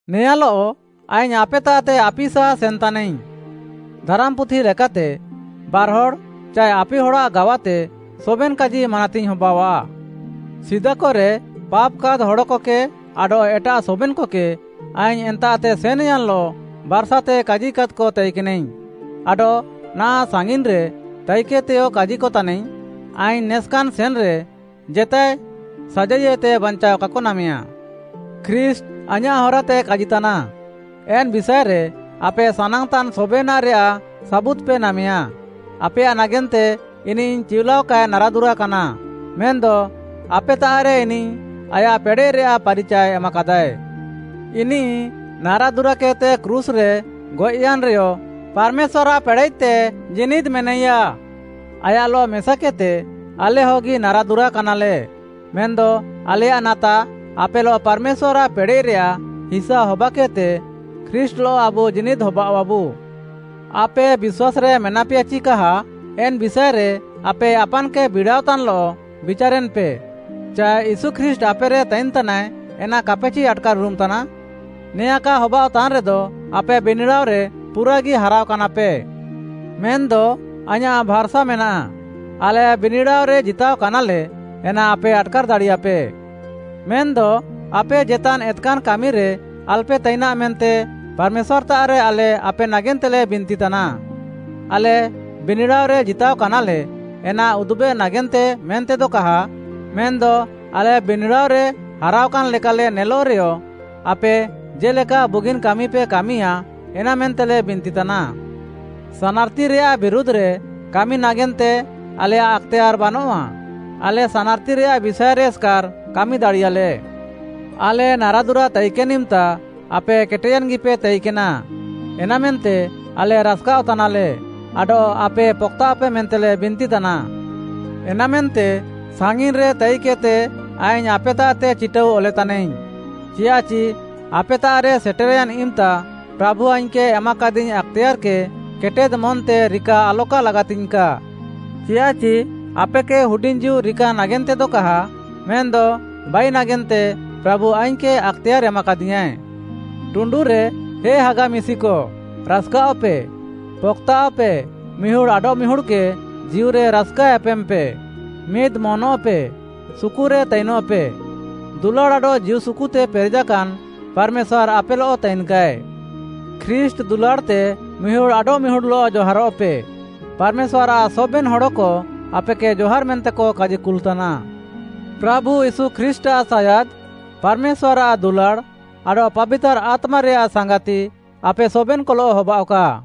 ନେଆଁଲଃ ଆଇଙ୍ଗ୍‌ ଆପେତାଃତେ ଆପିସା ସେନ୍‌ତାନାଇଙ୍ଗ୍‌। ଧାରାମ୍‌ପୁଥି ଲେକାତେ, ବାର୍‌ହଡ଼୍‌ ଚାଏ ଆପିହଡ଼୍‌ଆଃ ଗାୱାତେ ସବେନ୍‌ କାଜି ମାନାତିଙ୍ଗ୍‌ ହବାଅଃଆ। ସିଦାକରେ ପାପ୍‌କାଦ୍‌ ହଡ଼କକେ ଆଡଃ ଏଟାଃ ସବେନ୍‌କକେ, ଆଇଙ୍ଗ୍‌ ଏନ୍ତାଃତେ ସେନ୍‌ୟାନ୍‌ଲଃ ବାର୍‌ସାତେ କାଜିକାଦ୍‌କ ତାଇକେନାଇଙ୍ଗ୍‌, ଆଡଃ ନାହାଁଃ ସାଙ୍ଗିନ୍‌ରେ ତାଇକେଦ୍‌ତେୟ କାଜିକତାନାଇଙ୍ଗ୍‌, ଆଇଙ୍ଗ୍‌ ନେସ୍‌କାନ୍‌ ସେନ୍‌ରେ, ଜେତାଏ ସାଜାଇଏତେ ବାଞ୍ଚାଅ କାକ ନାମେୟା। ଖ୍ରୀଷ୍ଟ୍‌ ଆଇଁୟାଃ ହରାତେ କାଜିତାନା, ଏନ୍‌ ବିଷାଏରେ ଆପେ ସାନାଙ୍ଗ୍‌ତାନ୍‌ ସବେନାଃରେୟାଃ ସାବୁଦ୍‌ପେ ନାମେୟା। ଆପେୟାଃ ନାଗେନ୍ତେ ଇନିଃ ଚିଉଲାଅ କାଏ ନାରାଦୁରାକାନା। ମେନ୍‌ଦ ଆପେତାଃରେ ଇନିଃ ଆୟାଃ ପେଡ଼େଃରେୟାଃ ପାରିଚାଏ ଏମାକାଦାଏ। ଇନିଃ ନାରାଦୁରାକେଦ୍‌ତେ କ୍ରୁଶ୍‌ରେ ଗଏଃୟାନ୍‌ରେୟ ପାର୍‌ମେଶ୍ୱାର୍‌ଆଃ ପେଡ଼େଃତେ ଜୀନିଦ୍‌ ମେନାଇୟା। ଆୟାଃଲଃ ମେସାକେଦ୍‌ତେ ଆଲେ ହଗି ନାରାଦୁରାକାନାଲେ, ମେନ୍‌ଦ ଆଲେୟାଃ ନାତା ଆପେଲଃ ପାର୍‌ମେଶ୍ୱାର୍‌ଆଃ ପେଡ଼େଃରେୟାଃ ହିସା ହବାକେଦ୍‌ତେ ଖ୍ରୀଷ୍ଟ୍‌ଲଃ ଆବୁ ଜୀନିଦ୍‌ ହବାଅଃଆବୁ। ଆପେ ବିଶ୍ୱାସ୍‌ରେ ମେନାପେୟା ଚି କାହା, ଏନ୍‌ ବିଷାଏରେ ଆପେ ଆପାନ୍‌କେ ବିଡ଼ାଅତାନ୍‌ଲଃ ବିଚାରେନ୍‌ପେ, ଚାଏ ୟୀଶୁ ଖ୍ରୀଷ୍ଟ୍‌ ଆପେରେ ତାଇନ୍‌ତାନାଏ, ଏନା କାପେ ଚି ଆଟ୍‌କାର୍‌ଉରୁମ୍‌ ତାନା? ନେଆଁଁ କା ହବାଅଃତାନ୍‌ ରେଦ, ଆପେ ବିନିଡ଼ାଅରେ ପୁରାଗି ହାରାଅକାନାପେ। ମେନ୍‌ଦ ଆଇଁୟାଃ ଭାର୍‌ସା ମେନାଃ, ଆଲେ ବିନିଡ଼ାଅରେ ଜିତାଅକାନାଲେ, ଏନା ଆପେ ଆଟ୍‌କାର୍‌ ଦାଡ଼ିୟାପେ। ମେନ୍‌ଦ ଆପେ ଜେତାନ୍ ଏତ୍‌କାନ୍‌ କାମିରେ ଆଲପେ ତାଇନାଃ ମେନ୍ତେ ପାର୍‌ମେଶ୍ୱାର୍‌ତାଃରେ ଆଲେ ଆପେ ନାଗେନ୍ତେଲେ ବିନ୍ତିତାନା। ଆଲେ ବିନିଡ଼ାଅରେ ଜିତାଅକାନାଲେ ଏନା ଉଦୁବେ ନାଗେନ୍ତେ ମେନ୍ତେଦ କାହା, ମେନ୍‌ଦ ଆଲେ ବିନିଡ଼ାଅରେ ହାରାଅକାନ୍‌ ଲେକାଲେ ନେଲଃ ରେୟ, ଆପେ ଜେ'ଲେକା ବୁଗିନ୍‌ କାମିପେ କାମିୟାଁ, ଏନାମେନ୍ତେଲେ ବିନ୍ତିତାନା। ସାନାର୍‌ତିରେୟାଃ ବିରୁଧ୍‌ରେ କାମି ନାଗେନ୍ତେ ଆଲେୟାଃ ଆକ୍‌ତେୟାର୍‌ ବାନଃଆ, ଆଲେ ସାନାର୍‌ତିରେୟାଃ ବିଷାଏରେ ଏସ୍‌କାର୍‌ କାମି ଦାଡ଼ିୟାଃଲେ। ଆଲେ ନାରାଦୁରା ତାଇକେନ୍‌ ଇମ୍‌ତା ଆପେ କେଟେୟାନ୍‌ଗିପେ ତାଇକେନା, ଏନାମେନ୍ତେ ଆଲେ ରାସ୍‌କାଅଃ ତାନାଲେ ଆଡଃ ଆପେ ପକ୍‌ତାଃଅପେ ମେନ୍ତେଲେ ବିନ୍ତିତାନା। ଏନାମେନ୍ତେ ସାଙ୍ଗିନ୍‌ରେ ତାଇକେଦ୍‌ତେ ଆଇଙ୍ଗ୍‌ ଆପେତାଃତେ ଚିଟାଉ ଅଲେତାନାଇଙ୍ଗ୍‌, ଚିୟାଃଚି ଆପେତାଃରେ ସେଟେର୍‌ୟାନ୍‌ ଇମ୍‌ତା ପ୍ରାଭୁ ଆଇଙ୍ଗ୍‌କେ ଏମାକାଦିଙ୍ଗ୍‌ ଆକ୍‌ତେୟାର୍‌କେ କେଟେଦ୍‌ ମନ୍‌ତେ ରିକା ଆଲକା ଲାଗାତିଙ୍ଗ୍‌କା। ଚିୟାଃଚି ଆପେକେ ହୁଡିଙ୍ଗ୍‌ ଜୀଉ ରିକା ନାଗେନ୍ତେଦ କାହା, ମେନ୍‌ଦ ବାଇ ନାଗେନ୍ତେ ପ୍ରାଭୁ ଆଇଙ୍ଗ୍‌କେ ଆକ୍‌ତେୟାର୍‌ ଏମାକାଦିୟାଁଏ। ଟୁଣ୍ଡୁରେ ହେ ହାଗା ମିଶିକ, ରାସ୍‌କାଅଃପେ, ପକ୍‌ତାଃଅପେ, ମିହୁଡ଼୍‌ ଆଡଃମିହୁଡ଼୍‌କେ ଜୀଉରେ ରାସ୍‌କା ଏପେମ୍‌ପେ, ମିଦ୍‌ ମନ୍‌ଅଃପେ, ସୁକୁରେ ତାଇନଃପେ। ଦୁଲାଡ଼୍‌ ଆଡଃ ଜୀଉସୁକୁତେ ପେରେଜାକାନ୍ ପାର୍‌ମେଶ୍ୱାର୍‌ ଆପେଲଃ ତାଇନ୍‌କାଏ। ଖ୍ରୀଷ୍ଟ୍‌ ଦୁଲାଡ଼୍‌ତେ ମିହୁଡ଼୍‌ ଆଡଃମିହୁଡ଼୍‌ଲଃ ଜହାରଃପେ। ପାର୍‌ମେଶ୍ୱାର୍‌ଆଃ ସବେନ୍‌ ହଡ଼କ ଆପେକେ ଜହାର୍‌ ମେନ୍ତେକ କାଜିକୁଲ୍‌ତାନା। ପ୍ରାଭୁ ୟୀଶୁ ଖ୍ରୀଷ୍ଟ୍‌ଆଃ ସାୟାଦ୍‌, ପାର୍‌ମେଶ୍ୱାର୍‌ଆଃ ଦୁଲାଡ଼୍‌, ଆଡଃ ପାବିତାର୍‌ ଆତ୍ମାରେୟାଃ ସାଙ୍ଗାତି ଆପେ ସବେନ୍‌କଲଃ ହବାଅଃକା।